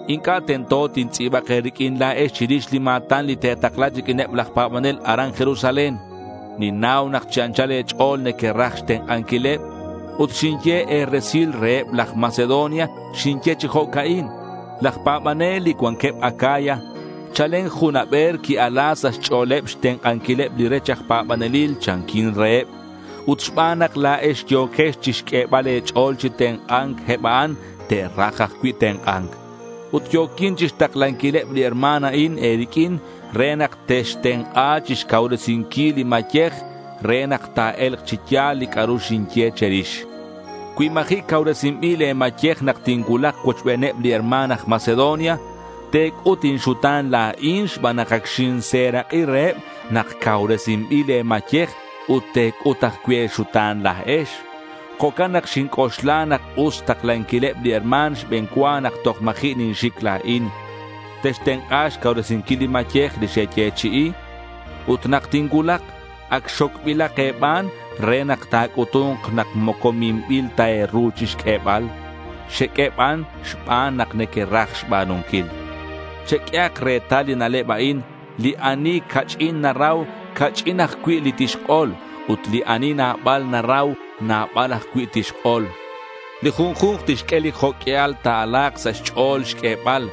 Inc'a' tento tintz'i̱bak e̱riq'uin chirix li ma̱tan li te̱takla riq'uineb laj pa̱banel aran Jerusalén. Ninnau nak chi anchal e̱ch'o̱l nequeraj xtenk'anquileb. Ut xinye e̱resilal reheb laj Macedonia. Xinye chi jo'ca'in: Laj pa̱banel li cuanqueb Acaya chalen jun haber qui-ala sa' xch'o̱leb xtenk'anquileb li rech aj pa̱banelil, chanquin reheb. Ut xban nak la̱ex yo̱quex chixq'uebal e̱ch'o̱l chi tenk'a̱nc eb a'an te'raj ajcui' tenk'a̱nc. Ut yo̱quin chixtaklanquileb li herma̱n a'in e̱riq'uin re nak textenk'a chixcauresinquil le̱ mayej re nak ta̱e̱lk chi ya̱l li c'a'ru xinye che̱rix. Cui ma̱ji' cauresinbil le̱ mayej nak tincuulak cuochbeneb li herma̱n aj Macedonia, te̱c'ut inxuta̱n la̱in xban nak ac xinserak'i reheb nak cauresinbil le̱ mayej ut te̱c'ut ajcui' e̱xuta̱n la̱ex. Jo'can nak xinc'oxla nak us xtaklanquileb li herma̱n xbe̱n cua nak toj ma̱ji' ninxic la̱in. Textenk'a xcauresinquil li mayej li xeyechi'i. Ut nak tincuulak, ac xocbilak e̱ban, re nak ta̱c'utu̱nk nak moco minbil ta e̱ru chixq'uebal. Xeq'ue ban xban nak nequeraj xba̱nunquil. Cheq'uehak retal li na'leb a'in: li ani ca'ch'in narau, ca'ch'in ajcui' li tixk'ol. Ut li ani nabal narau, nabal ajcui' tixk'ol. Li junju̱nk tixq'ue li jo' q'uial ta̱ala̱k sa' xch'o̱l xq'uebal.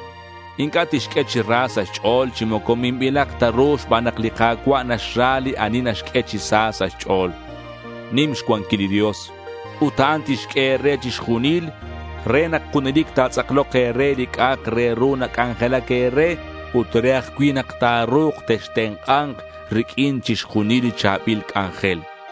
Inc'a' tixq'ue chi ra sa' xch'o̱l, chi moco minbilak ta ru xban nak li Ka̱cua' naxra li ani naxq'ue chi sa sa' xch'o̱l. Nim xcuanquil li Dios. Ut a'an tixq'ue e̱re chixjunil re nak junelic ta̱tz'aklok e̱re li c'a'ak re ru nac'anjelac e̱re ut re ajcui' nak ta̱ru̱k textenk'a̱nk riq'uin chixjunil li cha̱bil c'anjel.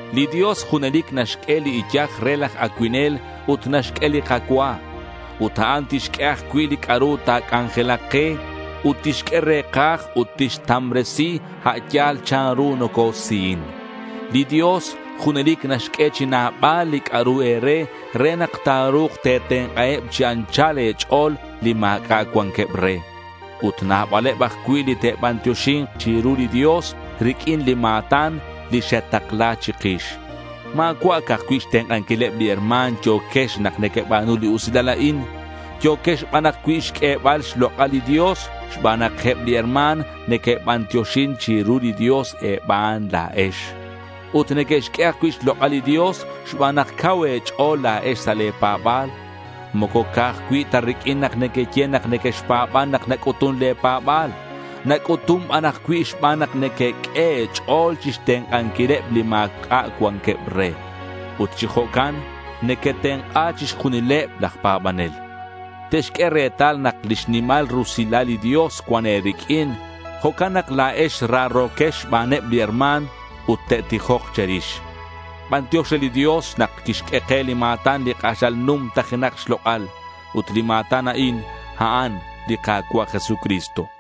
Li Dios junelic naxq'ue li iyaj re laj acuinel ut naxq'ue li kacua. Ut a'an tixq'ue ajcui' li c'a'ru ta̱c'anjelak ke. Ut tixq'ue re̱kaj ut tixtambresi a' yal chanru nocosihin. Li Dios junelic naxq'ue chi nabal li c'a'ru e̱re re nak ta̱ru̱k te̱tenk'aheb chi anchal e̱ch'o̱l li ma̱c'a' cuanqueb re. Ut nabaleb ajcui' li te'bantioxi̱nk chiru li Dios riq'uin li ma̱tan li xetakla chikix. Ma̱cua' ca'aj cui' xtenk'anquileb li herma̱n yo̱quex nak nequeba̱nu li usilal a'in. Yo̱quex ban ajcui' xq'uebal xlok'al li Dios xban nak eb li herma̱n neque'bantioxin chiru li Dios e̱ban la̱ex. Ut neque'xq'ue ajcui' xlok'al li Dios xban nak cau e̱ch'o̱l la̱ex sa' le̱ pa̱ba̱l. Moco ca'aj cui' ta riq'uin nak nequeye nak nequexpa̱ban nak nac'utun le̱ pa̱ba̱l. Nac'utun ban ajcui' xban nak nequeq'ue e̱ch'o̱l chixtenk'anquileb li ma̱c'a' cuanqueb re. Ut chi jo'can nequetenk'a chixjunileb laj pa̱banel. Te'xq'ue retal nak lix nimal rusilal li Dios cuan e̱riq'uin. Jo'can nak la̱ex raro̱quex xbaneb li herma̱n ut te'tijok che̱rix. Bantiox re li Dios nak quixq'ue ke li ma̱tan li k'axal numtajenak xlok'al. Ut li ma̱tan a'in, a'an li Ka̱cua' Jesucristo.